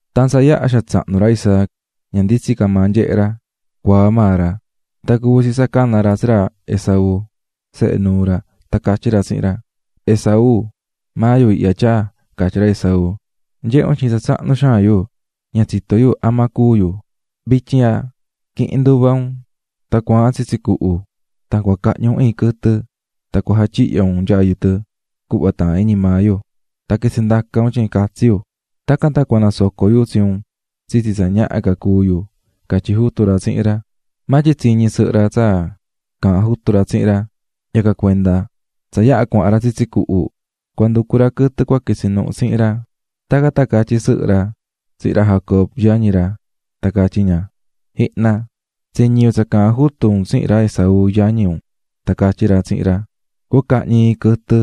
Tan tsa yaha xaan tsahnu ra Isaac, ña nditsín ca maa nyehé ra, cuaá maa ra, tan cuvi̱ tsi tsa cana̱ ra tsi ra Esaú, sehe nuu ra tan catyí ra tsihin ra: --¡Esaú! ―Maa yu ihya, tyaa --catyí ra Esaú. --Nyehé un tyin tsa tsahnu xaan yu, ña tsitó yu ama cua cúu yu. Vityin ihya, qui̱hin nduva un, cua̱ahan tsitsi cuhu tan cahñi iin quɨtɨ, tan jatyihyo un nyayu tɨ cuhva taahán iñi maa yu, tan quitsi ndaca un nyayu can catsi yu, tacan tan cua nasoco yu tsi un tsitsi tsa ñaha ca cúu yu ―catyí jutu ra tsihin ra. Maa tyin tsiñí ñi sɨhɨ ra tsa caahán jutu ra tsihin ra; yacan cuenda tsa yaha cuahan ra tsitsi cuhu cua nducu ra quɨtɨ cua quitsi nuhu tsihin ra, tacan tan catyí sɨhɨ ra tsihin ra Jacob, yañi ra tan catyí ña: --Ji̱hna, tsiñi̱ yu tsa caahán jutu un tsihin ra Esaú yañi un tan catyí ra tsihin ra: ꞌCua cahñi iin quɨtɨ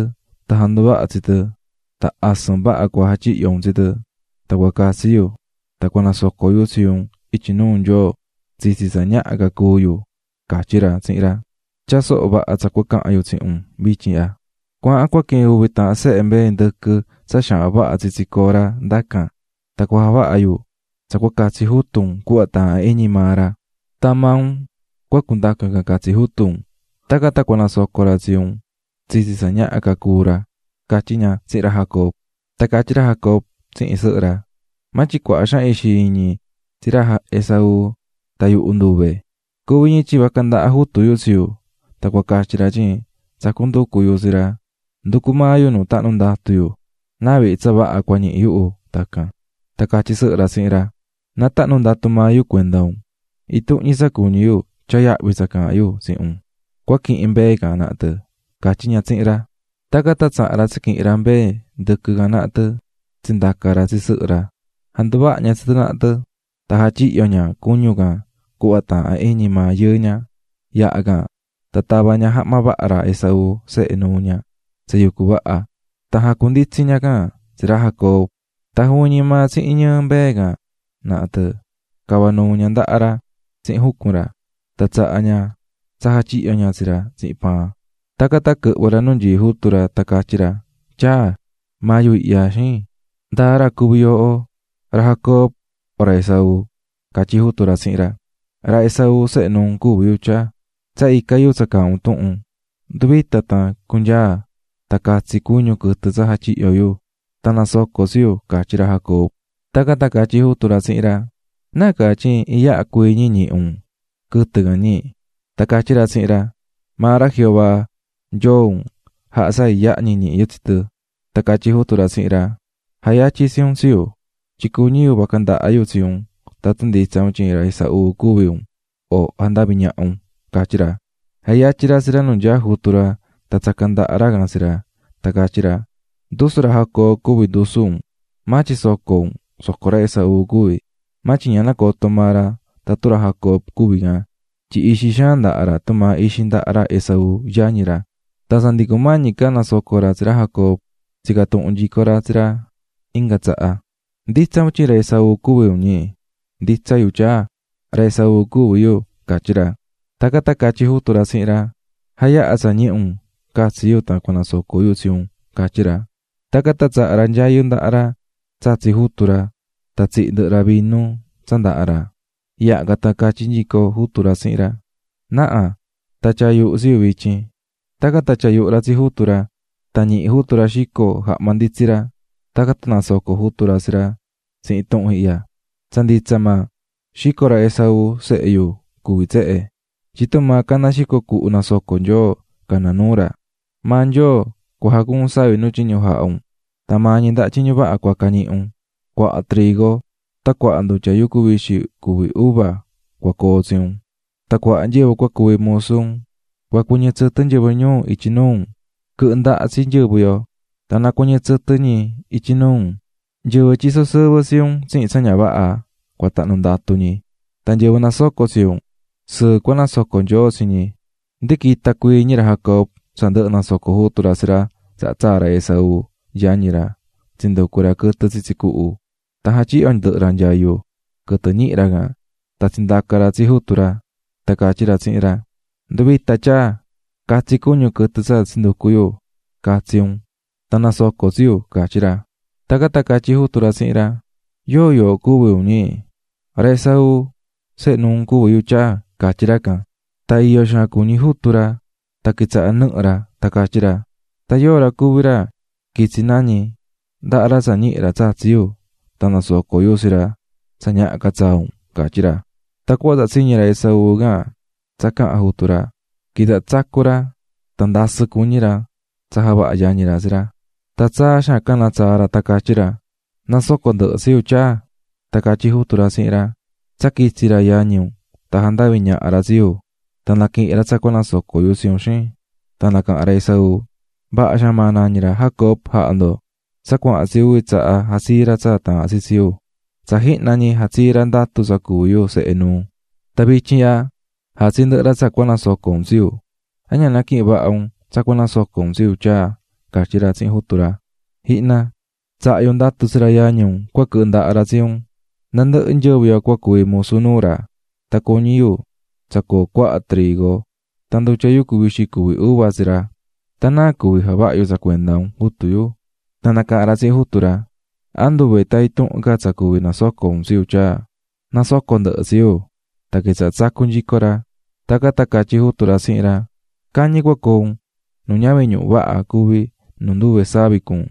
tan ja̱nduvaha tsi tɨ tan asɨn vaha cua jatyihyo un tsi tɨ tan cua catsi yu tan cua nasoco yu tsi un ityi nuu Nyoo tsitsi tsa ñaha ca cúu yuꞌ, catyí ra tsihin ra. Tya̱a soho vaha tsa cua cahan yu tsihin un vityin ihya. Cua̱ahan cua quihin uvi taahan sehe mbee ndɨquɨ tsa xaahan vaha tsitsi cora ndacan tan cua javaha yu tsa cua catsi jutu un cuhva taahán iñi maa ra. Tan maa un cua cundaca can catsi jutu un, tacan tan cua nasoco ra tsi un tsitsi tsa ñaha ca cúu ra ―catyí ña tsihin ra Jacob. Tan catyí ra Jacob tsihin sɨhɨ ra: --Maa tyin cuaha xaan ixi iñí tsi ra Esaú tan yuhu nduve. Cuvi ñi tyin vaca ndaha jutu yu tsi yu; tan cua catyi ra tyin tsacú nducu yu tsi ra, nducú maa yu nu tahnu ndatu yu, náa vihi tsa vaha cua ñihi yu tacan. Tan catyí sɨhɨ ra tsihin ra: --Na tahnu ndatu maa yu cuenda un, intuhun ñi tsa cuñí yu tya̱a yahvi tsa caahán yu tsihin un, cua quihin mbee can naha tɨ ―catyí ña tsihin ra. Tacan tan tsaha̱n ra tsi quihi̱n ra mbee ndɨquɨ can naha tɨ tsindaca̱ ra tsi sɨhɨ ra. Janduvaha̱ ña tsi tɨ naha tɨ tan jatyihyo̱ ña cuñu can cuhva taahán iñi maa yɨɨ ña. Yaha can, tan tava̱ ña jahma vaha ra Esaú, sehe nuu ña tsa yucú vaha tan jacunditsi̱ ña can tsi ra Jacob. Tan juvin ñi maa tsihin ñɨɨ mbee can naha tɨ cava̱ nuu ña ndaha ra tsihin jucun ra, tan tsaha̱ ña tsa jatyihyo̱ ña tsi ra tsihin paan. Tacan tan quɨhvɨ̱ ra nu nyií jutu ra tan catyí ra: --Tyaa. --Maa yu ihya, xin, ¿ndáa ra cuví yooho ra Jacob o ra Esaú? --catyí jutu ra tsihin ra. --Ra Esaú, sehe nuu un cuví yu, tyaa, tsa ica̱ yu tsa caahán un tuhun. Ndu̱vita tan cu̱nyaa tan catsi cuñu quɨtɨ tsa jatyihyo̱ yu, tan na̱soco tsi yu --catyí ra Jacob. Tacan tan catyí jutu ra tsihin ra: --¿Nácaa tyin iyaha cuii ñi ñihi̱ un quɨtɨ can, ñi? Tan catyí ra tsihin ra: --Maa ra Jehová, Nyoo un, jaha̱ tsa iyaha ñi ñihi̱ yu tsi tɨ. Tan catyí jutu ra tsihin ra: --Na̱tuhva nu nyaá yu ihya, tyin cuñí yu vaca ndaha yu tsi un tatun nditsa un tyin ra Esaú cuví un o jandaví ñaha un ―catyí ra. Natuhva̱ ra nu nyaá jutu ra tan tsaca̱ ndaha ra can tsi ra, tan catyí ra: "Ndusu ra Jacob cuví ndusu un, maa tyin soco un, soco ra Esaú cuví." Maa tyin ña nacoto̱ maa ra tatun ra Jacob cuví can, tyin ixi xaan ndaha ra tumaa tsa ixi ndaha ra Esaú, yañi ra. Tan tsa ndi cumañi ca nasoco ra tsi ra Jacob, tsica̱ tuhun nyico ra tsi ra inga tsaha: --¿Nditsa un tyin ra Esaú cuví un, ñi? --Nditsa yu, tyaa, ra Esaú cuví yu ―catyí ra. Tacan tan catyí jutu ra tsihin ra: --Ja̱yaha tsa ñihi̱ un catsi yu tan cua nasoco yu tsi un --catyí ra. Tacan tan tsaha̱ ra nyayu ndahá ra tsatsi̱ jutu ra tan tsihi̱ ndɨhɨ ra vinu tsa ndahá ra. Yaha can tan catyí nyico jutu ra tsihin ra: --Na̱ha, tya̱a yuhu tsi yu vityin. Tacan tan tyaa̱ yuhu ra tsi jutu ra. Tan ñihi̱ jutu ra xico jahma nditsí ra, tacan tan nasoco̱ jutu ra tsi ra tsihin tuhun ihya: "Tsa nditsa maa, xico ra Esaú, sehe yu, cuví tsehe, tyin tumaa caná xico cuhu nasoco̱ Nyoo, caná nuu ra. Maa Nyoo cua jacuun savi nu tyiñu jahá un tan maa ñi ndaha tyiñu vaha cua naquihin un, cuaha trigo tan cuaha ndutya yucu vixi cuví uva cua coo tsi un. Tan cuaha nyɨvɨ cua cuvi musu un, cua cuɨñɨ tsɨtɨ nyɨvɨ ñuu ityi nuu un. Quɨ̱hɨ ndaha tsi nyɨvɨ yo, ¡tan na cuɨñɨ tsɨtɨ ñi ityi nuu un! Nyɨvɨ tyisó sɨvɨ tsi un tsihin tsa ña vaha, cua tahnu ndatu ñi, tan nyɨvɨ nasocó tsi un sɨɨ cua nasoco Nyoo tsi ñi." Ndi quita̱ cuii ñi ra Jacob tsa ndɨhɨ̱ nasoco̱ jutu ra tsi ra, tsaha tsaa̱ ra Esaú, yañi ra, tsinducu̱ ra quɨtɨ tsitsi cuhu. Tan jatyihyo̱ ndɨhɨ ra nyayu quɨtɨ ñihi̱ ra can tan tsindaca̱ ra tsi jutu ra tan catyí ra tsihin ra: --Ndu̱vita tyaa, ca̱tsi cuñu quɨtɨ tsa tsinducu̱ yu catsi un, tan na̱soco tsi yu ―catyí ra. Tacan tan catyí jutu ra tsihin ra: --¿Yóo, yooho cuvi un, ñi? --Ra Esaú, sehe nuu un cuví yu, tyaa ―catyí ra can. Tan iyó xaan cuñí jutu ra tan quitsaha̱ nɨhɨ ra, tan catyí ra: --¿Tan yóo ra cuví ra quitsi̱ nañi ndahá ra tsa ñihi̱ ra tsatsi̱ yu, tan nasoco̱ yu tsi ra tsa ñaha ca tsaa un? ―catyí ra. Tan cuhva tsa tsiñi̱ ra Esaú can tsa caha̱n jutu ra, quitsaha̱ tsacú ra tsa ndasɨ́ cuñí ra tsa javaha̱ yañi ra tsi ra, tan tsaa xaan canatsaa̱ ra tan catyí ra: --¡Na̱soco ndɨhɨ tsi yu, tyaa! Tan catyí jutu ra tsihin ra: --Tsa quitsi̱ ra yañi un tan jandavi̱ ñaha ra tsi yu tan naquihi̱n ra tsa cua nasoco yu tsi un, xin. Tan nacaha̱n ra Esaú: --Vaha xaan maa nañí ra Jacob jaha̱ ndo, tsa cuahan tsi uvi tsaha jatsii̱ ra tsa taahán tsi tsi yu: Tsa jihna ñi jatsii̱ ra ndatu tsa cuví yu sehe nuu, tan vityin ihya jatsii̱ ndɨhɨ ra tsa cua nasoco un tsi yu. ¿An ña naquihi̱n vaha un tsa cua nasoco un tsi yu, tyaa? --catyí ra tsihin jutu ra. --Ji̱hna, tsaha̱ yu ndatu tsi ra yañi un cua quɨhɨ ndaha ra tsi un, nandɨhɨ nyɨvɨ yo cua cuvi musu nuu ra, tan cuñí yu tsa coo cuaha trigo tan ndutya yucu vixi cuví uva tsi ra. Tan ¿náa cuví javaha yu tsa cuenda un, jutu yu? Tan nacaha̱n ra tsihin jutu ra: --¿An nduve tan intuhun ca tsa cuví nasoco un tsi yu tyaa? ¡Na̱soco ndɨhɨ tsi yu! Tan quitsaha̱ tsacú nyico ra. Tacan tan catyí jutu ra tsihin ra: "Cañi cua coo un nu ñavin ñuhu vaha cuví nu nduve savi cuún,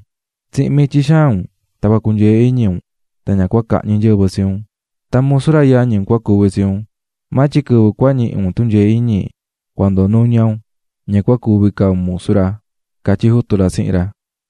Tsihin mityi xaan un cua cunyee iñi un tan ña cua cahñi nyɨvɨ tsi un, tan musu ra yañi un cua cuvi tsi un, maa tyin quɨvɨ cua ñihi un tunyee iñi cua ndoo nuña un, ña cua cuvi ca un musu ra", catyí jutu ra tsihin ra.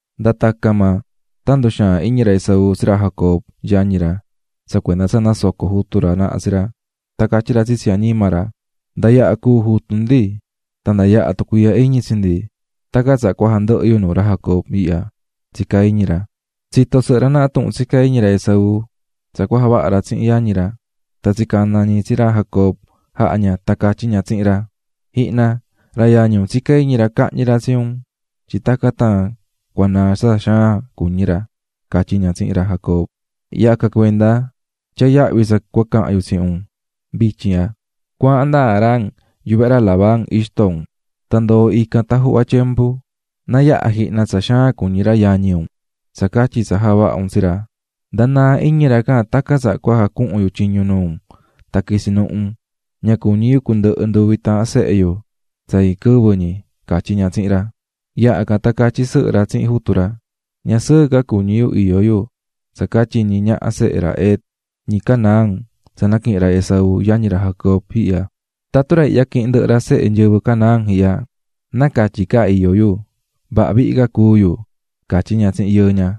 Nda tacan maa tan nduxaa̱n iñi ra Esaú tsi ra Jacob, yañi ra, tsa cuenda tsa nasoco̱ jutu ra naha tsi ra, tan catyí ra tsitsi añima ra: "Nda yaha cúu jutu ndi tan nda yaha tucuiihya iñi tsi ndi, tacan tsaha cua jandɨhɨ yu nuu ra Jacob ihya", catyí ra. Tsito̱ sɨhɨ ra naha tuhun tsicá iñi ra Esaú tsa cua javaha ra tsihin yañi ra, tan tsicana̱ ñi tsi ra Jacob jaha̱ ña tan catyí ña tsihin ra: --Ji̱hna, ra yañi un tsicá iñi ra cahñi ra tsi un tyin tacan tan cua naa tsa xaan cuñí ra ―catyí ña tsihin ra Jacob―. Yacan cuenda tya̱a yahvi tsa cua cahan yu tsihin un vityin ihya; cua̱ahan nda Harán yuvehe ra Labán ixto un, ndo̱o ndacan tan juhva tyembu, na yaha jihna tsa xaan cuñí ra yañi un tsa catyi tsa javaha̱ un tsi ra, nda naa iñi ra can tacan tsaha cua jacuhun yu tyiñu nuu un tan quitsi nuhu un; ¡ña cuñí yu cundɨhɨ nduvi taahan sehe yu tsa iin quɨvɨ ñi! ―catyí ña tsihin ra. Yaha can tan catyí sɨhɨ ra tsihin jutu ra: --Ña sɨɨ ca cuñí yu iyó yu tsa catyi ñi ñaha sehe ra Het, ñi Canaán, tsa naquihi̱n ra Esaú, yañi ra Jacob ihya. Tatun ra ihya quihin ndɨhɨ sehe nyɨvɨ Canaán ihya, náa catyi ca iyó yu vaha vihi ca cúu yu --catyí ña tsihin yɨɨ ña.